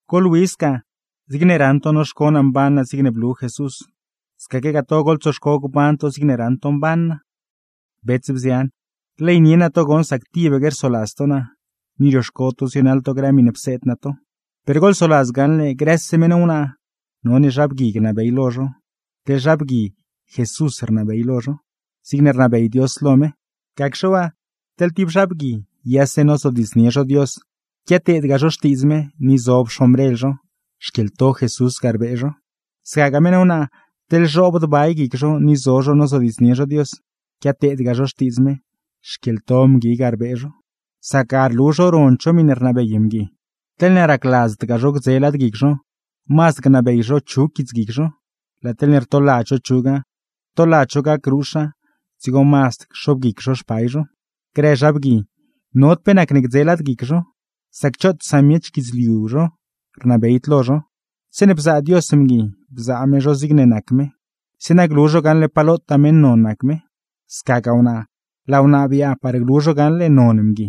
Goḻwi sca, zigne raṉ to noxco naa mban naa zigne blu Jesús, scaquegaa to goḻtsoxco gban to zigne raṉ to mban naa. Bets, bzian, rleynie naa to goṉ sac tibaque rsoladz to naa, ni rioxco to zienaḻ to grë miṉe pseed naa to. Per goḻsoladz gaṉle: grëse meṉ wnaa, none zha bgui gnabey lo zho, teḻ zha bgui Jesús rnabey lo zho, zigne rnabey Dios lo me. Gacxe waa, teḻ tib zha bgui yase nozodiidznie zho Dios, quiateedgaa zho xtiidz me, ni zob xombrel zho; xquieḻto Jesús ga rbee zho. Scagaa meṉ wnaa, teḻ zhoobd bay guic zho ni zo zho nozodiidznie zho Dios, quiateedgaa zho xtiidz me, xquieḻto mgui ga rbee zho; sac ga rlu zho rond zho miṉe rnabey mgui. Teḻne racladzdgaa zho gdze lad guic zho, mazd gnabey zho chug guitsguic zho. Laa teḻne rtoladz zho chuga, rtoladz zho gacruxa, dzigo mazd cxobguic zho xpay zho. Grë zha bgui, nod pe nacne gdze lad guic zho, sac choot samiech guidzliu zho rnabeyd lo zho. Zeeṉe bzaa Dios mgui, bzaa me zho zigne nac me, zeeṉa glu zho gaṉle pa lotaa meṉ non nac me; scagaa wnaa, laa wnaa biaaṉ par glu zho gaṉle non mgui.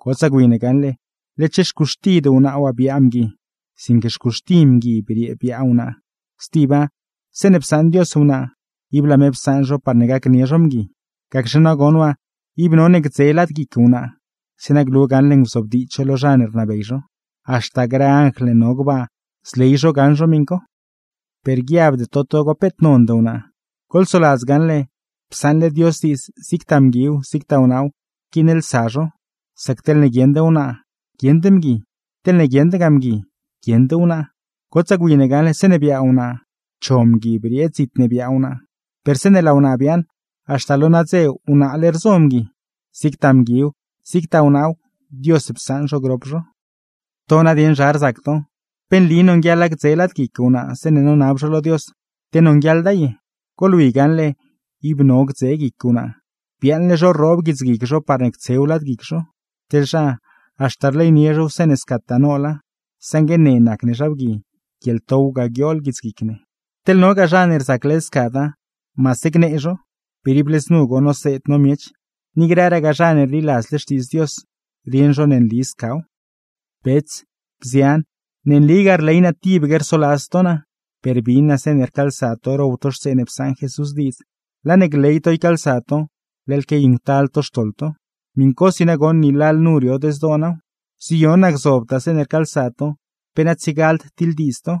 Gotsaa gwi ne gaṉle, letxe xcuxtid wnaa waa biaa mgui, sinque xcuxti mgui briee biaa wnaa. Stiba, zeeṉe psaṉ Dios wnaa, ib laa me psaṉ zho par gacnie zho mgui. Gacxe nagoṉ waa ib none gdze lad guic wnaa, zeeṉa glu gaṉle nguzobdiidz zho lo zha ne rnabey zho; haxta grë anjl ne no gbaa zley zho gaṉ zho miṉ co. Per guiabde to togo peet nond wnaa, goḻsoladz gaṉle psaṉle Dios diidz zigtaa mguiw, zigtaa wnaaw rquiinlsa zho; sac teḻne guieṉd wnaa guieṉd mgui, teḻne guieṉdgaa mgui guieṉd wnaa. Gotsaa gwi ne gaṉle, zeeṉe biaa wnaa cho mgui briee dzit ne biaa wnaa, per zeeṉe laa wnaa biaaṉ, haxta lo nadze wnaale rzo mgui; zigtaa mguiw, zigtaa wnaaw Dios psaṉ zho grop zho. ¿To nadieṉ zha rzac to? ¿Pe nli nonguieḻa gdze lad guic wnaa zeeṉe nonab zho lo Dios, te nonguieḻda ye? Goḻwi gaṉle ib no gdze guic wnaa, biaaṉle zho rroob guits guic zho parne ctsew lad guic zho; teḻ zha, haxta rleynie zhow zeeṉe scataa noola, saṉgue ne nac ne zha bgui, guieḻtow ga guiool guitsguic ne. Teḻ nogaa zha ne rzac led scada, maase gnee zho. Per ible znu goṉ noseed no miech, ni grëragaa zha ne rliladzle Xtiidz Dios, rieṉ zho ne nli scaw. Bets, bzian, ne nligaa rley naa tibaque rsoladz to naa, per bin naa zeeṉe rcaalsa to row to xtsee ne psaṉ Jesús diidz, laa ne gley to ycaalsa to, leḻ quiayuṉctal to xtoḻ to. Miṉcosi nagoṉ ni lalnu riod zdoo naaw. Ziyon naa gzobtaa zeeṉe rcaalsa to, pe na tsiegald tiḻdiidz to,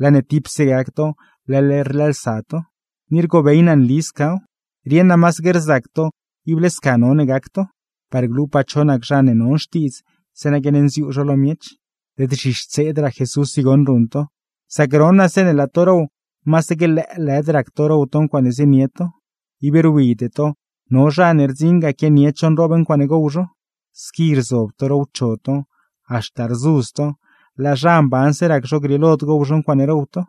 laa ne tipse gac to leḻ rlëëlsa to. Ni rgobey naa nli scaw. Rieṉ naa masaque rzac to ible sca none gac to, parne glupaa cho nac zha ne non xtiidz, zeeṉa guiaṉnziuu zho lo miech. Led zhixtseedraa Jesús i goṉ ruṉ to. Sac ron naa zeeṉe laa to row, masaque lëëlëd rac to row to ncuaaṉe zienie to, ib rwide to no zha ne rdziṉ ga quianied zho nroob ncuaaṉe gow zho. Squi rzob to rowcho to, haxta rzudz to; laa zha mbanse rac zho grieelod gow zho ncuaaṉe row to.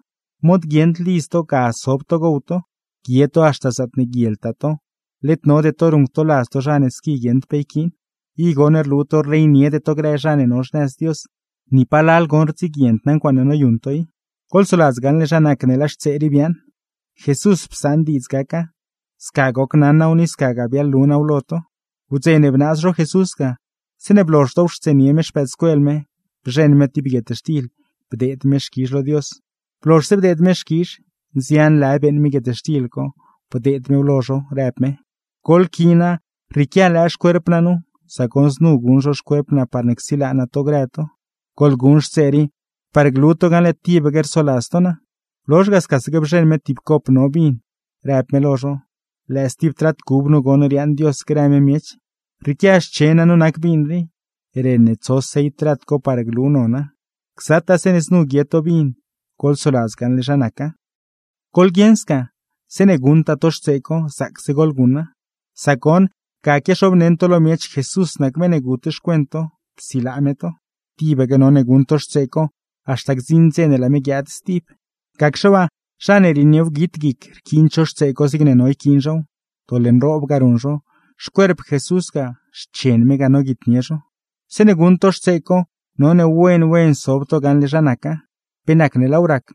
¿Mod guieṉd lidz to, ga sob to gow to, guie to haxta zaatne guieltaa to, led node to ruṉctoladz to zha ne squi guieṉd pe yquiin? I goṉ rlu to rleyniede to grë zha ne no xnëz Dios. ¡Ni palal goṉ rdziguiend naa ncuaaṉe noyuṉ to i! Goḻsoladz gaṉle zha nac ne laa xtsee rii biaaṉ, Jesús psaṉ diidz gaca, sca gocnaṉ naaw ni scagaa biaḻlu naaw lo to. Wdze ne bnaaz zho Jesús ga, zeeṉe blozh dowxtseenie me xpëëdscuel me, bzheṉ me tib guietxtil, bdeed me xquizh lo Dios; blozhse bdeed me xquizh, nzian lë beeṉ me guietxtil co, bdeed mew lo zho rëb me: “Goḻquiina, rrieequia lëë xcuerp naa nu, sac goṉ znu guṉ zho xcuerp naa parne csilaa naa to grë to. Goḻguṉ xtsee rii, parne glu to gaṉle tibaque rsoladz to naa.” Blozh ga, scaque bzheṉ me tib cop no vin, rëb me lo zho: “Lëë stib trat cub nu goṉ riaaṉ Dios grë me miech, rrieequia xchen naa nu nac vin rii, ren ne tso sell trat co par glu nona. Gzataa zeeṉe znu guie to vin, goḻsoladz gaṉle zha naca.” Goḻguieṉ sca, zeeṉe guṉtaa to xtsee co zaacse goḻguṉa, sac goṉ, ga quiaxobneṉ to lo miech Jesús nac meṉ ne gut xcuent to, psilaa me to. Tibaque none guṉ to xtsee co, haxta gdziṉ dze ne laa me guiaad stib. Gacxe waa, zha ne rieniewguit guic rquiind zho xtsee co zigne no yquiin zhow, doḻ nroob ga ruṉ zho, xcuerp Jesús ga, xchen me ga noguitnie zho. Zeeṉe guṉ to xtsee co, none wen wen sob to gaṉle zha naca, pe nacne laaw rac,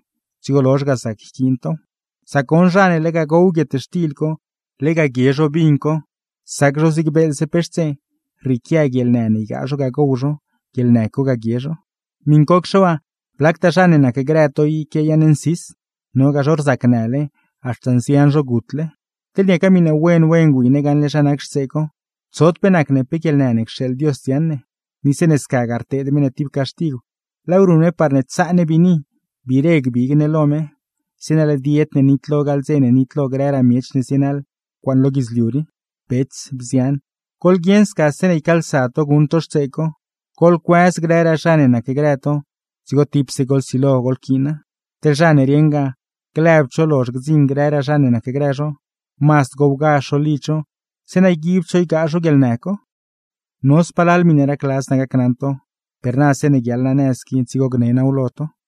dzigo lozh ga zac yquiin tow. Sac goṉ zha ne lega gow guietxtil co, lega guie zho vin co, sac zhow zig beeḻze pe xtsee; rrieequia guieḻnë ne ygaa zho ga gow zho, guieḻnë co ga guie zho. Miṉcocxe waa, blactaa zha ne nacgrë to i quiayaaṉ nsis, nogaa zho rzacnële, haxta nzian zho gutle. Teḻne niaca miṉe wen wen gwi ne gaṉle zha nac xtsee co, tsod pe nacne pe guieḻnë ne cxeeḻ Dios dziaṉ ne. Ni zeeṉe scagaa rteed me ne tib caxtigw, laaw ruṉ me parne tsaa ne biini gbiire gbig ne lo me, zeeṉa led yed ne nitlo gaḻ dze ne nitlo grëraa miech ne zienaḻ ncuaaṉe lo guidzliu rii. Bets, bzian, goḻguieṉ sca zeeṉe ycaalsa to guṉ to xtsee co, goḻcuëz grëraa zha ne nacgrë to dzigo tipse goḻsilo goḻquiina. Teḻ zha ne rieṉgaa lëbd zho lozh gdziṉ grëraa zha ne nacgrë zho, mazd gowgazh zho lidz zho, zeeṉa yguibd zho ygaa zho guieḻnë co. No spalal miṉe racladz naa gacnaṉ to, per naa zeeṉe guiaḻ naa nëz qui dzigo gne naaw lo to.